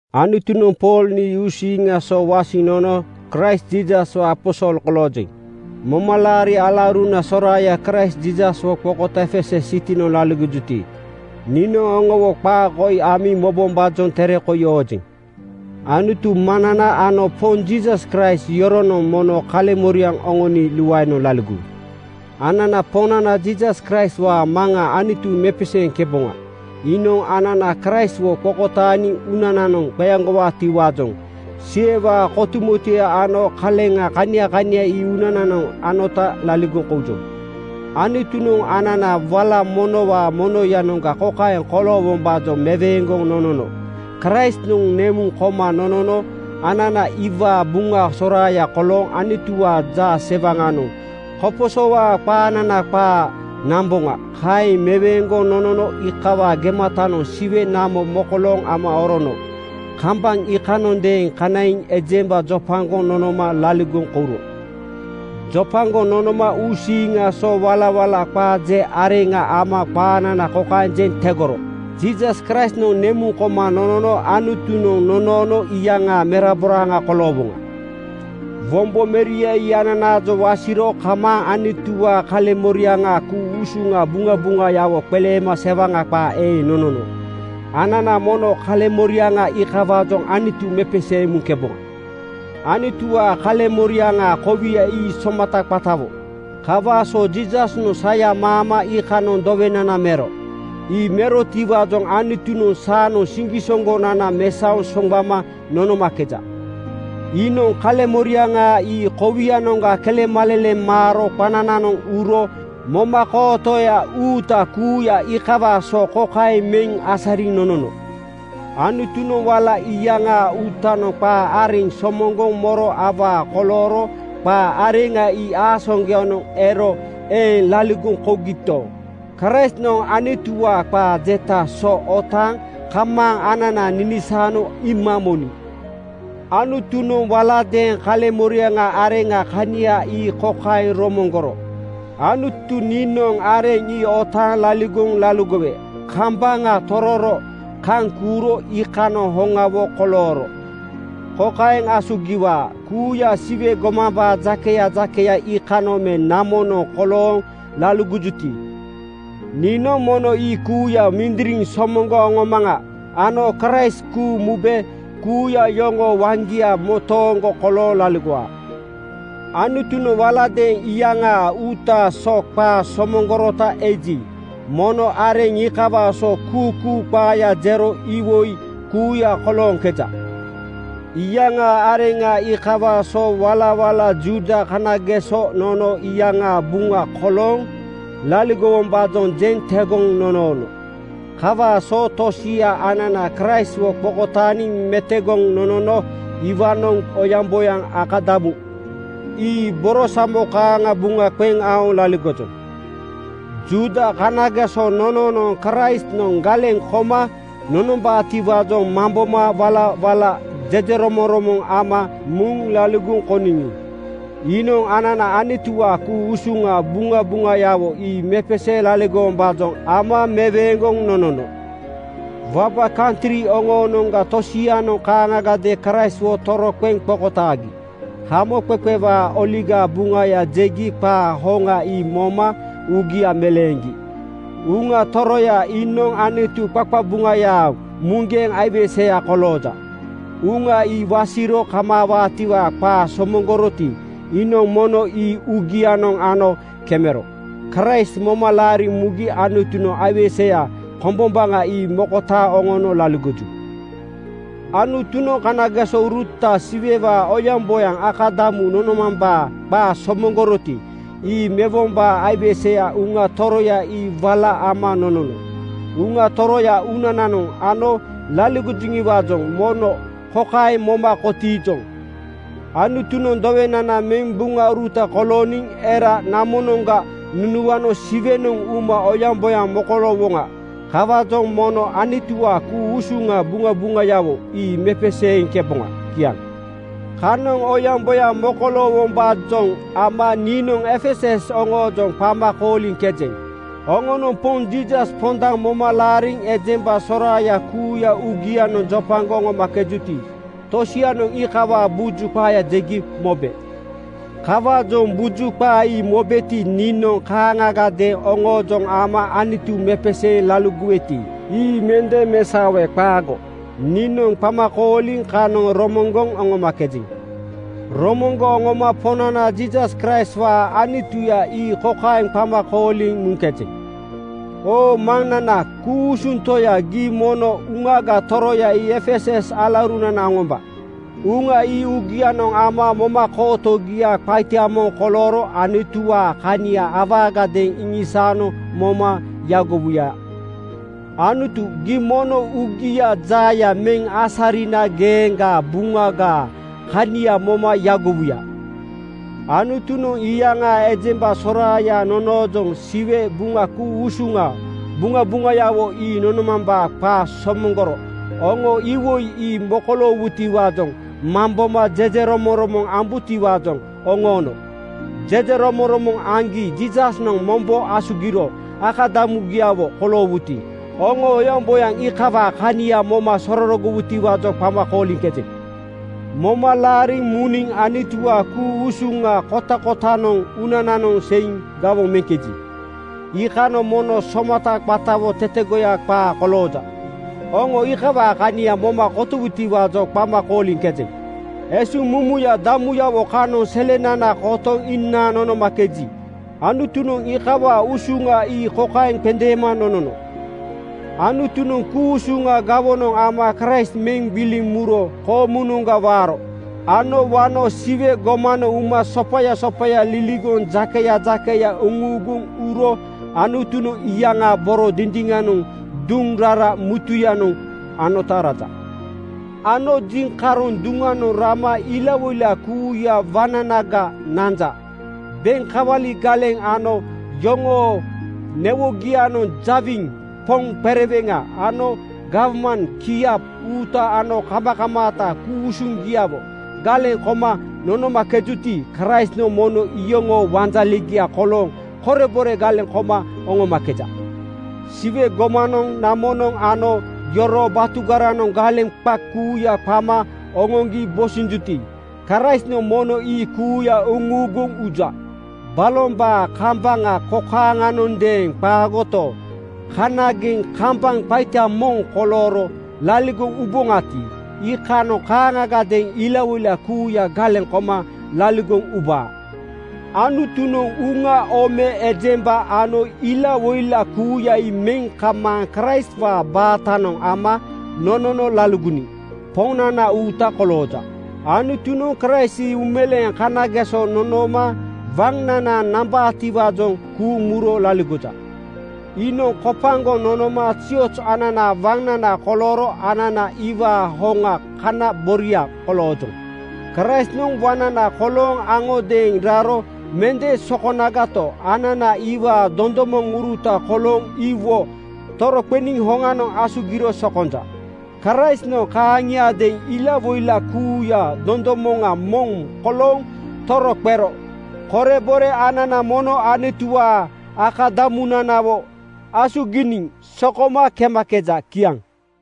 Anutunoŋ Pool nii uusiiŋaa so wasiŋ nono Kraist Jiisaswaa aposol koloojeŋ. Momalaari alauruna soraaya Kraist Jiisaswo qokotaaŋ Efesus sitinoŋ laligojuti, niinoŋ oŋowo qaa amiŋ mobombaajoŋ tere koi oojeŋ. Anutu Maŋnana ano Poŋ Jiisas Kraist yoronoŋ mono kaleŋ-moriaŋ oŋoni luaenoŋ laligowu. Anana Poŋnana Jiisas Kraistwaa Maŋa Anutu mepeseeŋkeboŋa. Iinoŋ anana Kraistwo qokotaaniŋ uunananoŋ qeaŋgowaatiwaajoŋ Siwewaa kotumotueya ano kaleŋa kania kania ii uunananoŋ anota laligoŋ koujoŋ. Anutunoŋ anana wala monowaa monoyanoŋga kokaeŋ koloowombaajoŋ meweeŋgoŋ nonono: Kraistnoŋ nemuŋ koma nonono anana iwaa buŋa soraaya kolooŋ Anutuwaa jaase-waŋanoŋ koposowaa qaanana qaa namboŋa. Kaeŋ meweeŋgoŋ nonoma iikawaa gematanoŋ Siwe namo mokolooŋ ama oroono. Kambaŋ iikanoŋadeeŋ kanaiŋ ejemba jopagoŋ nonoma laligoŋ kouro. Jopagoŋ nonoma uusiiŋaa so walawala qaa je areŋa ama qaanana kokaeŋ jeŋ tegoro: Jiisas Kraistnoŋ nemuŋ koma nonono Anutunoŋ nonoono iyaŋaa meraboraaŋa koloowoŋa. Wombo Meria ii ananaajoŋ wasiro kamaaŋ Anutuwaa kaleŋmoriaŋaa ku-usuŋa buŋabuŋayawo qeleema sewaŋa qaa eeŋ nonono. Anana mono kaleŋmoriaŋa iikawaajoŋ Anutu mepeseeŋ muŋkeboŋa. Anutuwaa kaleŋmoriaŋaa kowia ii somata qatawo. Kawaa so Jiisasnoŋ saya maama iikanoŋ dowenana mero. Ii merotiwaajoŋ Anutunoŋ saanoŋ siŋgisoŋgonana mesaoŋ soŋgbama nonomakeja. Iinoŋ kaleŋmoriaŋa ii kowianoŋga kelemaleleŋ maaro qanananoŋ uro. Momakootoya uuta kuuya iikawaa so kokaeŋ meŋ asariŋ nonono: Anutunoŋ wala iyaŋaa uutanoŋ qaa areŋ somoŋgoŋ moro awaa kolooro qaa areŋa ii aasaŋgoyanoŋ ero eeŋ laligoŋ kougito, Kraistnoŋ Anutuwaa qaa jetaa so otaaŋ kamaaŋ anana ninisaano iima moniŋ. Anutunoŋ waladeeŋ kaleŋmoriaŋ areŋaa kania ii kokaeŋ romoŋgoro, “Anutu niinoŋ areŋ ii otaaŋ laligoŋ laligowe kambaŋa tororo kaŋ kuuro iikanoŋ hoŋawo kolooro kokaeŋ asugi-waa: Kuuya Siwe gomambaa jakeya jakeya iikanoŋ me namonoŋ kolooŋ laligojuti, niinoŋ mono ii kuuya mindiriŋ somoŋgoŋ oŋomaŋa ano Kraist kuuŋ mube kuuya yoŋoo waŋgia motooŋgo kolooŋ laligowaa.” Anutunoŋ waladeeŋ iyaŋaa uutaa so qaa somoŋgorota eji, mono areŋ iikawaa so kuukuu qaaya jero iwoi kuuya kolooŋkeja. Iyaŋaa areŋa iikawaa so walawala Juuda kanageso nono iyaŋaa buŋa kolooŋ laligowombaajoŋ jeŋ tegoŋ nonoono. Kawaa so tosia anana Kraistwo qokotaaniŋ metogoŋ nonono iwaanoŋ oyaŋboyaŋ akadamu ii borosamo kaaŋa buŋa qeŋ aoŋ laligojoŋ. Juuda kanageso nononoŋ Kraistnoŋ galeŋ koma nonombaatiwaajoŋ mamboma walawala jejeromoŋromoŋ ama muŋ laligoŋ kouniŋi, iinoŋ anana Anutuwaa ku-usuŋa buŋabuŋayawo ii mepeseeŋ laligowombaajoŋ ama meweeŋgoŋ nonono. Waba kantri oŋoonoŋga tosianoŋ kaaŋagadeeŋ Kraistwo toroqeŋ qokotaagi. Hamoqeqewaa Oligaa Buŋaya jegi qaa hoŋa ii moma uugia meleeŋgi. Uŋa Toroya iinoŋ Anutu qaqabuŋayaa muŋgeŋ aiweseya kolooja. Uŋa ii wasiro kamaawaatiwaa qaa somoŋgoroti, iinoŋ mono ii uugianoŋ ano kemero. Kraist moma laariŋ mugi Anutunoŋ aiweseya kombombaŋa ii mokotaaŋ oŋono laligoju. Anutunoŋ kanagesouruta Siwewaa oyaŋboyaŋ akadamu nonomambaa qaa somoŋgoroti, ii mewombaa aiweseya Uŋa Toroya ii wala ama nonono. Uŋa Toroya uunananoŋ ano laligojiwaajoŋ mono kokaeŋ moma kotiijoŋ: Anutunoŋ dowenana meŋ buŋauruta kolooniŋ era namonoŋga nunuano Siwenoŋ uma oyaŋboyaŋ mokoloowoŋa. Kawaajoŋ mono Anutuwaa ku-usuŋa buŋabuŋayawo ii mepeseeŋkeboŋa. Kiaŋ. Kanoŋ oyaŋboyaŋ mokoloowombaajoŋ ama niinoŋ Efesus oŋoojoŋ qama kooliŋkejeŋ. Oŋonoŋ Poŋ Jiisas pondaŋ moma laariŋ ejemba soraaya kuuya uugianoŋ jopagoŋ oŋomakejuti, tosianoŋ iikawaa buju qaaya jegi mobe. Kawaajoŋ buju qaa ii mobeti, niinoŋ kaaŋagadeeŋ oŋoojoŋ ama Anutu mepeseeŋ laligoweti, ii mende mesaowe. Qaago. Niinoŋ qama kooliŋ kanoŋ romoŋgoŋ oŋomakejeŋ. Romoŋgoŋ oŋoma Poŋnana Jiisas Kraistwaa Anutuya ii kokaeŋ qama kooliŋ muŋkejeŋ, “Oo Maŋnana ku-usuŋ Toya, gii mono Uŋaga Toroya ii Efesus alaurunana oŋomba. Uŋa ii uugianoŋ ana momakootogia qaita moŋ kolooro Anutuwaa kania awaagadeeŋ iŋisaano moma yagowuya. Anutu, gii mono uugiaa jaaya meŋ asarina geeŋgaa Buŋagaa kania moma yagowuya.” Anutunoŋ iyaŋaa ejemba soraaya nonoojoŋ Siwe Buŋa ku-usuŋa buŋabuŋayawo ii nonomambaa qaa somoŋgoro oŋo iwoi ii mokoloowutiwaajoŋ mamboma jejeromoŋromoŋ ambutiwaajoŋ oŋoono. Jejeromoŋromoŋ aŋgi Jiisasnoŋ mombo asugiro akadamugiawo koloowuti, oŋo oyaŋboyaŋ iikawaa kania moma sorogowutiwaajoŋ qama kooliŋkejeŋ. Moma laariŋ muniŋ Anutuwaa ku-usuŋa kotakotanoŋ uunananoŋ seiŋ gawoŋ meŋkeji, iikanoŋ mono somata qatawo tetegoya qaa kolooja. Oŋo iikawaa kania moma kotowutiwaajoŋ qama kooliŋkejeŋ. Esuŋmumuya damuyawo kanoŋ selenana kotoŋ inaaŋ nonomakeji, Anutunoŋ iikawaa usuŋa ii kokaeŋ qendeema nonono: Anutunoŋ ku-usuŋa gawonoŋ ama Kraist meŋ gbiliŋ muro koomunoŋga waaro ano wano Siwe gomanoŋ uma sopaya sopaya liligoŋ jakeya jakeya uŋuuguŋ uro Anutunoŋ iyaŋaa boro dindiŋanoŋ duŋ rara mutuyanoŋ anota raja. Ano jiŋkaroŋ duŋanoŋ rama ilawoila kuuyaa waŋnanaga nanja. Beŋ kawali galeŋ ano yoŋoo newogianoŋ jawiŋ, poŋ qereweŋa ano gawman kiap uuta ano kamakamaata ku-usuŋgiawo galeŋ koma nonomakejuti, Kraistnoŋ mono iyoŋoo wanjalegia kolooŋ korebore galeŋ koma oŋomakeja. Siwe gomanoŋ, namonoŋ ano yoroo batugaranoŋ galeŋ qa kuuya qama oŋoŋgi bosinjuti, Kraistnoŋ mono ii kuuya uŋuuguŋ uja. Balombaa kambaŋ kokaaŋanondeeŋ qaagoto, kanageŋ kambaŋ qaita moŋ kolooro laligoŋ uboŋati, iikanoŋ kaaŋagadeeŋ ilawoila kuuya galeŋ koma laligoŋ ubaa. Anutunoŋ uŋa, ome, ejemba ano ilawoila kuuya ii meŋ kamaaŋ Kraistwaa baatanoŋ ama nonono laligoniŋ Poŋnana uuta kolooja. Anutunoŋ Kraist ii uumeleeŋ kanageso nonooma waŋnana nambaatiwaajoŋ kuuŋ muro laligoja. Iinoŋ kopagoŋ nonoma zioz ananaa waŋnana kolooro anana iwaa hoŋaa kana boboria koloojoŋ. Kraistnoŋ waŋnana kolooŋ aŋodeeŋ raro mende sokonagato, anana iwaa dondomoŋuruta kolooŋ iwo toroqeniŋ hoŋanoŋ asugiro sokonja. Kraistnoŋ kaaŋiadeeŋ ilawoila kuuyaa dondomoŋa moŋ kolooŋ toroqero korebore anana mono Anutuwaa akadamunanawo asuginiŋ sokoma kemakeja. Kiaŋ.